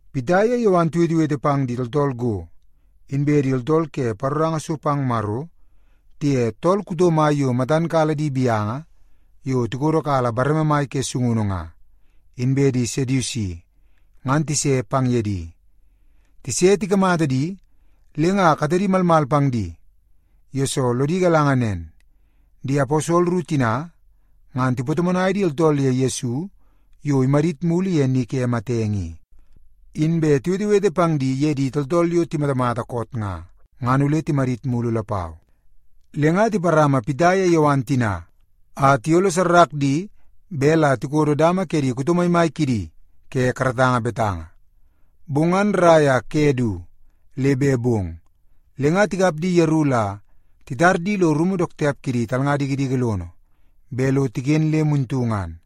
Pita ye Yowan tiwetewete pang di tooltool go, inbe di tooltool ke paroranga so pang Maro, tiye tool kuto mai yo matan kala di gaunu yo tikodo kala bareme mai ke sungunu nga, inbe di Sedusi, ngan tise pang ye di. Tise tikamata di, le nga katedi malmal pang di, yesoo lodi galanga nen, di aposol ru tina ngan tipatomonai di tooltool ye Yesu yo imadit mulu ye ni ke matenge i, inbe tiwetewete pang di ye di tooltool yo timatamata koot nga, ngan ole timadit mulu lapau. Le nga tiparama Pita iye Yowan tina a tiyololo di bet la tikodo dama ke di kuto maimai kidi ke karatanga betanga. Bong ngan rrai a ke du le bet bong, le nga tikap di yeru la titar di lo rumu dook tiap kidi talnga dikidiki lono bet lo tiken le muntu ngan.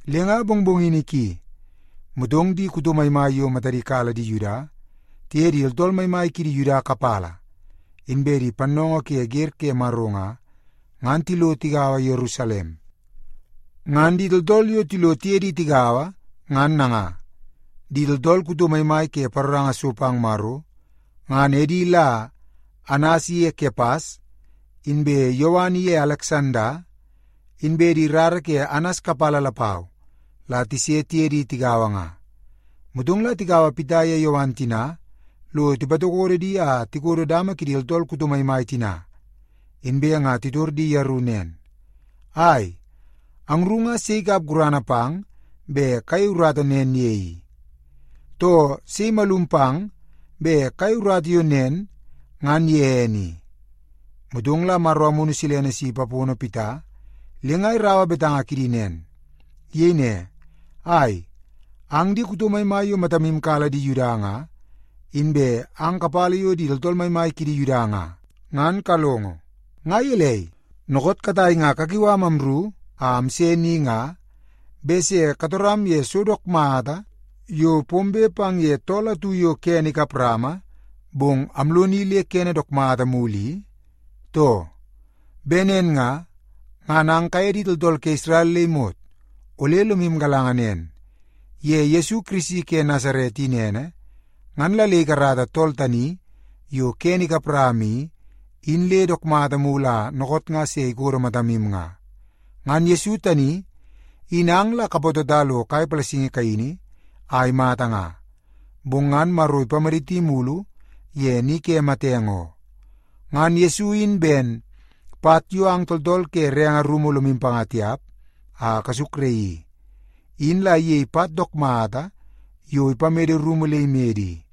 Le nga mongmongini ki, motong di kuto maimai yo matadi kala di Yuda tiye di tooltool maimai kidi Yuda kapala inbe di pannoongoo ke wer ke Maro nga, ngan tilo tigaua Yerusalem. Ngan di tooltool yo tilo tiye di tigaua ngan nanga: di tooltool kuto maimai ke paroranga so pang Maro, ngan edi la Anas iye Kepas, inbe Yowan iye Aleksanda, inbe di rara ke Anas kapala lapau la tise tiye di tigaua nga. Motong la tikaua Pita iye Yowan tina lo tipatokodo di a tikodo dama kidi tooltool kuto maimai tina, inbe nga titor di yeru nen, “Ai, angru nga sei ikap gurana pang bet kayei urata nen ye i? Too, sei imalum pang bet kayei urata yo nen ngan ye ene i?” Motong la Maro Amunu Silene si ipapono Pita, le nga iraua betanga kidi nen. Iyei ne, “Ai, ang di kuto maimai yo matamu kala di Yuda nga inbe ang kapala yo di tooltool maimai kidi Yuda nga, ngan kalongo! Nga gelei, dookoot katai nga kakiu am amru a amse ni nga bet se katoram ye so dook mata yo pombe pang ye tool atu yo kene kap rama bong amloni le kene dook mata mulu i, too? Bet nen nga, ngan ang kaye di tooltool ke Isrel le imot ole lomu galanga nen. Ye Yesu Kirisi ke Nasaret in ene, ngan la le ikarata tool tani yo kene ikap rama i, in le dook mata mulu a dookoot nga se ikodo matamu nga. Ngan Yesu tani in ang la kapatota lo kai palasingi kaini a imata nga, bong ngan Maro ipamaditi mulu ye ni ke matenge oo. Ngan Yesu in ben, ‘Pat yo ang tooltool ke renge rumu lomu panga tiap a kasukraii i, in la iyei pat dook mata yo ipamede rumu le imede i.’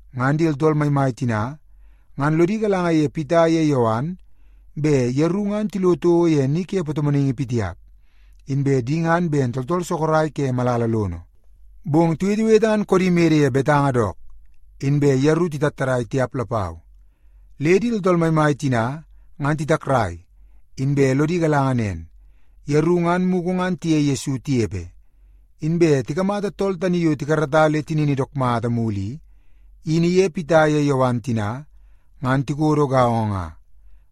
Ngan di tooltool maimai tina ngan lodi galanga ye Pita iye Yowan bet yeru ngan tilo toko ye ni ke patomonaingi pitiap, inbe di ngan ben tooltool sorok ke malala lono. Bong tiwetewete ngan koodi mede ye betanga dook, inbe yeru titattadai tiap lapau. Le di tooltool maimai tina ngan titakrai, inbe lodi galanga nen, yeru ngan mugu ngan tiye Yesu tinepe. Inbe tikamata tool tani yo tikarata le tinini dook mata mulu i, in iye Pita ye Yowan tina ngan tikodo gaongo nga.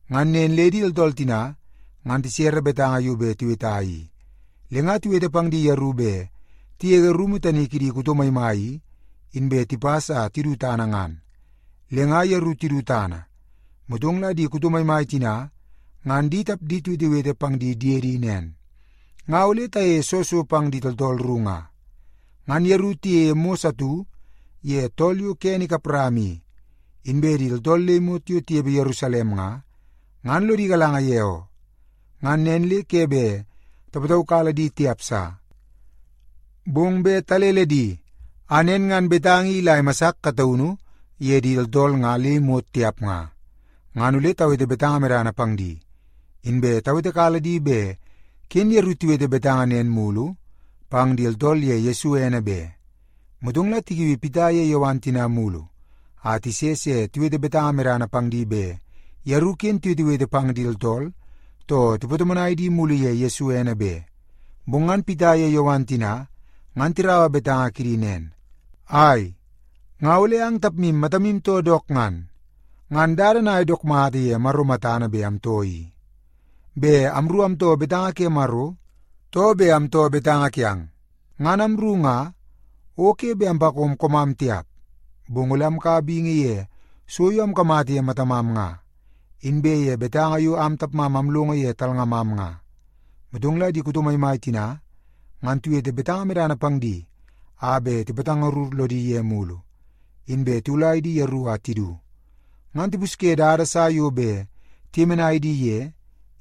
Ngan nen le di tooltool tina ngan tisere betanga yo bet tiweta i. Le nga tiwete pang di yeru bet tigege rumu tani kidi kuto maimai i, inbe tipas a tidu tana ngan. Le nga yeru tidu tana, motong la di kuto maimai tina ngan di tapdi tiwetewete pang di diedi nen, “Nga ole tayeie soo so pang di tooltool ru nga? Ngan yeru tiyeie mos atu ye tool yo kene ikap rama i, inbe di tooltool le imot yo tinepe Yerusalem nga, ngan lodi galanga ye oo. Ngan nen le ke bet tapataukala di tiap sa. Bong bet talele di a nen ngan betanga i ila imasar kataunu ye di tooltool nga le imot tiap nga, ngan ole tawete betanga medana pang di, inbe tawetekala di bet ken yeru tiwete betanga nen mulu pang di tooltool ye Yesu ene be.” Motong la tikiui Pita iye Yowan tina mulu a tise se tiwete betanga medana pang di bet yeru ken tiwetewete pang di tooltool too tipatomonai di mulu ye Yesu ene be. Bong ngan Pita ye Yowan tina ngan tiraua betanga kidi nen, “Ai, nga ole ang tapmu matamu too dook ngan? Ngan dada nangai dook mata ye Maro matana bet amtoo i? Bet amru amtoo betanga ke Maro, too bet amtoo betanga kiang? Ngan amru nga, o ke bet ampakom koomam tiap. Bong ole amkaua bingi ye so yo amkamata ye matamam nga, inbe ye betanga yo am tapmam amlongo ye talngamam nga.” Motong la di kuto maimai tina ngan tiwete betanga medana pang di a bet tipatangarur lodi ye mulu, inbe tiwulai di yeru a tidu. Ngan tipusye dada sa yo bet tiyemenai di ye,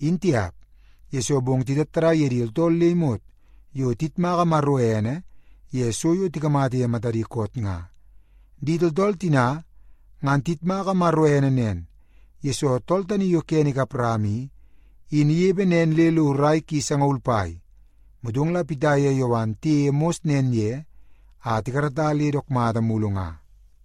in tiap, yesoo bong titattadai ye di tooltool le imot yo tiyitmaka Maro ene ye so yo tikamata ye matadi koot nga. Di tooltool tina ngan tiyitmaka Maro ene nen, yesoo tool tani yo kene ikap rama i, in inepe nen le lo rai ki sangaul pai, motong la Pita ye Yowan tiyeie mos nen ye a tikarata le dook mata mulu nga.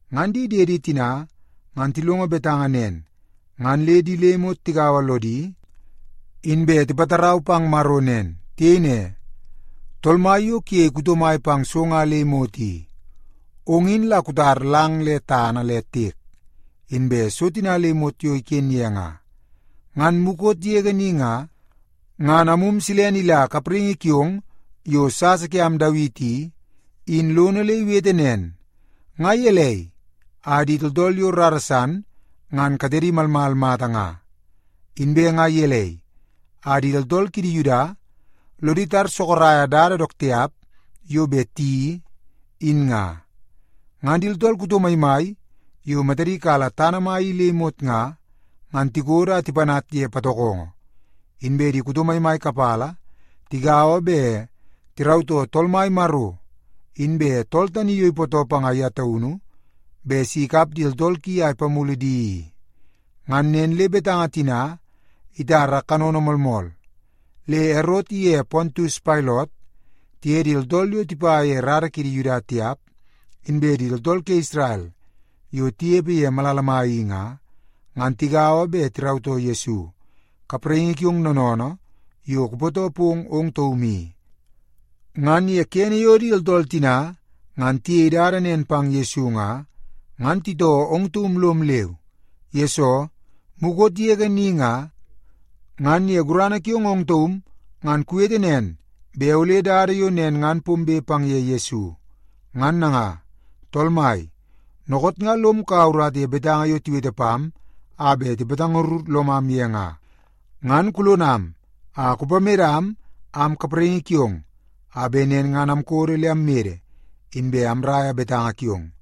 Ngan di diedi tina ngan tilongo betanga nen, ngan le di le imot tigaua lodi, inbe tipatarau pang Maro nen. Tiyei ne, “Tool Mai yo kuyei kuto mai pang so nga le imot i, ong in la kutar lang le tana le tiek, inbe so tina le imot yo iken ye nga. Ngan mukot yege ni nga, ngan Amum Silene ila kapraingi kiong yo sasa kiam Dawiti i, in lono le iwete nen, ‘Nga gelei a di tooltool yo rara san ngan katedi malmal mata nga? Inbe nga gelei a di tooltool kidi Yuda lodi tar sorok dada dook tiap yo bet tiyeii, in nga? Ngan di tooltool kuto maimai yo matadi kala tana mai i le imot nga, ngan tikodo a tipanat ye patokongo. Inbe di kuto maimai kapala tigaua bet tirautoo Tool Mai Maro inbe tool tani yo ipootoo panga ye taunu bet si ikap di tooltool ki a ipamulu di i.’ Ngan nen le betanga tina itara kanono moolmool, le Erot iye Pontius Pailot tiye di tooltool yo tipa ye rara kidi Yuda tiap, inbe di tooltool ke Isrel yo tinepe ye malala mai i nga, ngan tigaua bet tirautoo Yesu, kapraingi kiong noonoonoo yo kupootoo pong ong taum i. Ngan ye kene yo di tooltool tina ngan tiyei dada nen pang Yesu nga, ngan titoo ong taum lom leu. Yesoo, mukot yege ni nga, ngan ye gurana kiong ong taum ngan kuwete nen bet ole dada yo nen ngan pombe pang ye Yesu. Ngan nanga, Tool Mai, dookoot nga lom kaua urata ye betanga yo tiwete pam a bet tipatangarur lomam ye nga, ngan kulonam a kupamedam am kapraingi kiong a bet nen ngan amkodo le ammede, inbe amraia betanga kiong.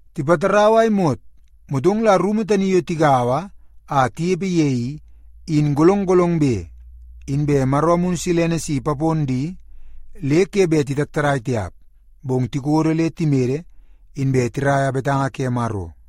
Tipatarau a imot, motong la rumu tani yo tigaua a tinepe ye i, in golong golongbe. Inbe Maro Amunu Silene si ipapon di le ke bet titattadai tiap, bong tikodo le timede, inbe tiraia betanga ke Maro.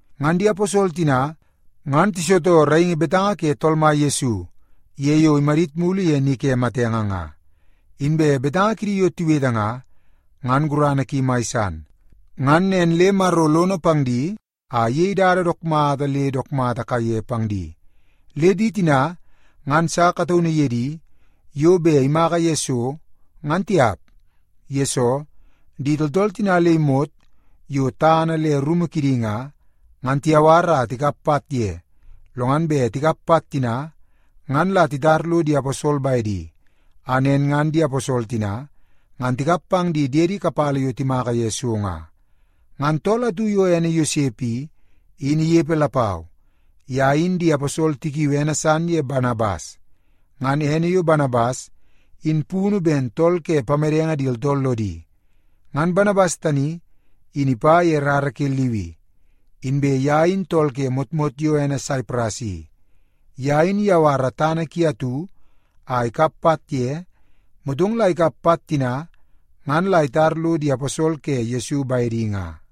Ngan di aposol tina ngan tisitoo raingi betanga ke Tool Mai Yesu ye yo imadit mulu ye ni ke matenge nga. Inbe betanga kidi yo tiwete nga, ngan gurana ki mai san. Ngan nen le Maro lono pang di a iyei dada dook mata le dook mata kaiye pang di. Le di tina ngan sa kataunu ye di yo bet imaka ye so, ngan tiap. Yesoo, di tooltool tina le imot yo tana le rumu kidi nga, ngan tiyawar a tikap pat ye, lo ngan bet tikap pat tina ngan la titar lo di aposol bedi, a nen ngan di aposol tina ngan tikap pang di diede kapala yo timaka ye so nga. Ngan tool atu yo ene Yosep i, in inepe lapau. Ye in di aposol tikiui ene san ye Banabas. (Ngan ene yo Banabas in punu ben Tool ke Pamedenge Di Tooltool Lodi.) Ngan Banabas tani, in ipa ye rara ke Liwi, inbe ye in tool ke motmot yo ene Saipras i. Ye in iyawara tana ki atu a ikap pat ye, motong la ikap pat tina ngan la itar lo di aposol ke Yesu bedi nga.